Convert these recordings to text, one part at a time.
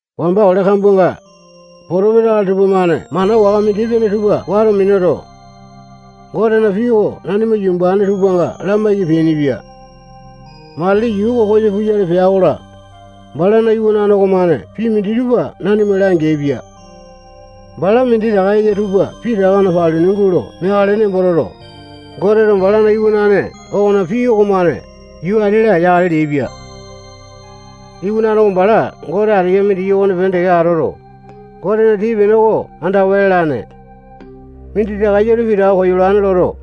Wamba ole kambuanga, potopesa akali tupamane mana waka mindi-pene tupa wato minuto, Gotena pii oko nanimana yumbane tupanga lamaiki peainipia. Matili yuu oko koyo puyale pea-kola, balana iwanane okomane pii minditupa nanima langeaipia. Bala minditaka eya tupa pitaka paluni gulo meakale nembo toto, Goteto bala iwanane okona pii okomane yuu ati-la yakale leaipia. Iwanane oko bala Gote ateya mindiki okonepene teke atoto, Gotena tii-pene oko andawa lalane. Minditaka eya tupa koyolane loto,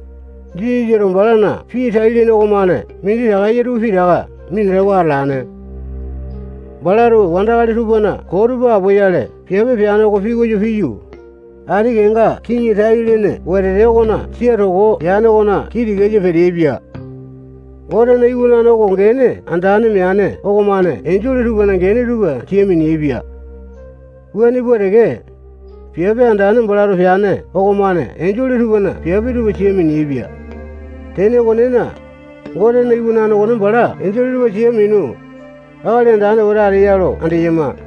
Jisasato balana pii tai-lene okomane minditaka eya tupa pitaka minatawa atalane. Balato wandakali tupana koo tupa apoyale piape peane oko pikoyo piyu, ati kenga kiŋi tai-lene wetete okona sia toko yane okona kii tikasa peteaipia. Gotena iwanane oko gene andane meane okomane enjole tupana gene tupa sia mineaipia Wuane pua teke, piape andane balato peane okomane enjole tupana piape tupa sia mineaipia. Tene okonena, Gotena Iwanane okone bala enjole tupa sia minu, Akali Andane wete ateya lo andeyama.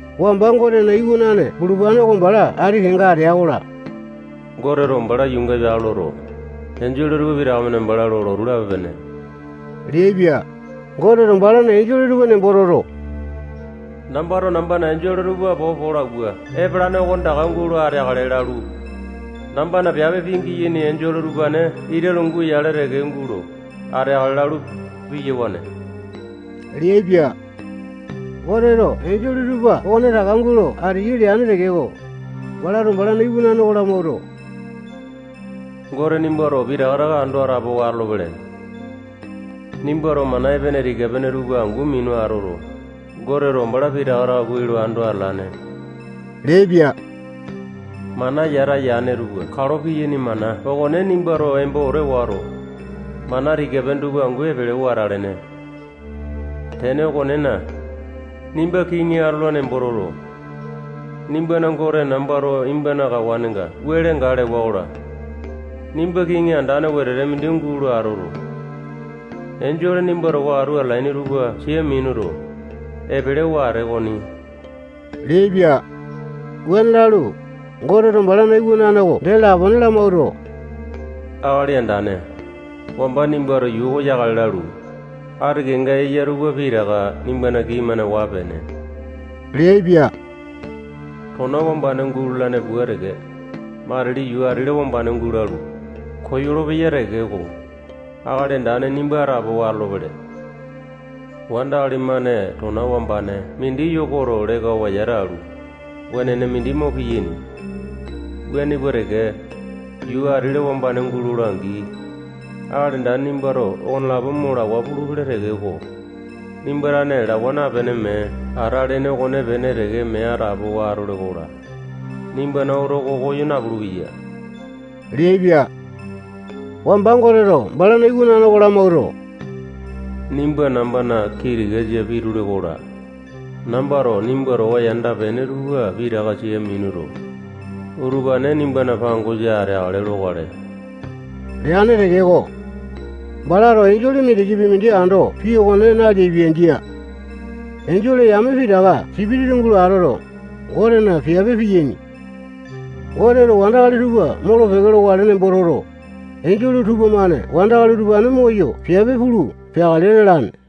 Wamba Gotena iwanane bulupane oko bala ati kenga atea-kola, Goteto bala yuunga epeakale loto, enjole tupa pitaka-mane bala lo lotu lape-pene leaipia. Goteto balana enjole tupa nembo toto, nambato nambana enjole tupa popo lo awua epalane okonetaka gulo ateakale lalu, nambana piape pingiyaini enjole utupane ita lungu yale teke gulo ateakale lalu, piyawane leaipia. Goteto enjole tupa okonetaka gulo ateyai leane tekeko, balato balana iwanane oko lamawuato, Gote nimbato pitaka taka ando atapowa atolopele. Nimbato mana epene tika-pene tupa angu minu atoto, Goteto bala pitaka taka kuai lo ando atalene leaipia. Mana yata yane tupa kalo piyaini mana okone nimbato embo wete wato, mana tika-pene tupa angu epele wete alene. Tene okonena, nimba kiŋi atola nembo toto, nimbana Gote nambato nimbana kawanenga wele gae lewa-kola, nimba kiŋi andane wetete mindi gulo atoto, enjole nimba towa atu atalaini tupa sia minuto, epelewa atee okoni leaipia. Wuane lalu, Goteto balana iwanane oko dee lapone lamawuato, Akali Andane, wamba nimbato yuu oko yakale lalu, ati kenga eya tupa pitaka nimbana kini-mane waa peene leaipia. Tona wambane gulalane pua teke, matili yuu ati-la wambane gulalu, koyolo-peya tekeko, Akali Andane nimba atapowa atolopele. Wandakali-mane tona wambane mindi yokoto lekawa yata alu, wenene mindi mo piyaini. Wuane pua teke, yuu ati-la wambane gulola-angi, Akali Andane nimbato okonelapo mo lawa pulupele tekeko, nimba tane lawa napene, mee atalene okonepene teke mee atapowa atole-kola, nimbana oto oko koyo napulu-peya leaipia. Wamba Goteto balana iwanane oko lamawuato, nimba nambana kii tikasa pitule-kola, nambato nimba towa yanda-pene tupa pitaka sia minuto, utupane nimbana pangosa ateakale lokale leane tekeko, balato enjole mindikipi mindi ando pii okone naleaipia. Jia. Enjole yame pitaka sipitisa gulo atoto, Gotena piape piyaini. Goteto wandakali tupa molo-peke lokale nembo toto, enjole tupamane wandakali utupane moyo piape pulu peakale lalane.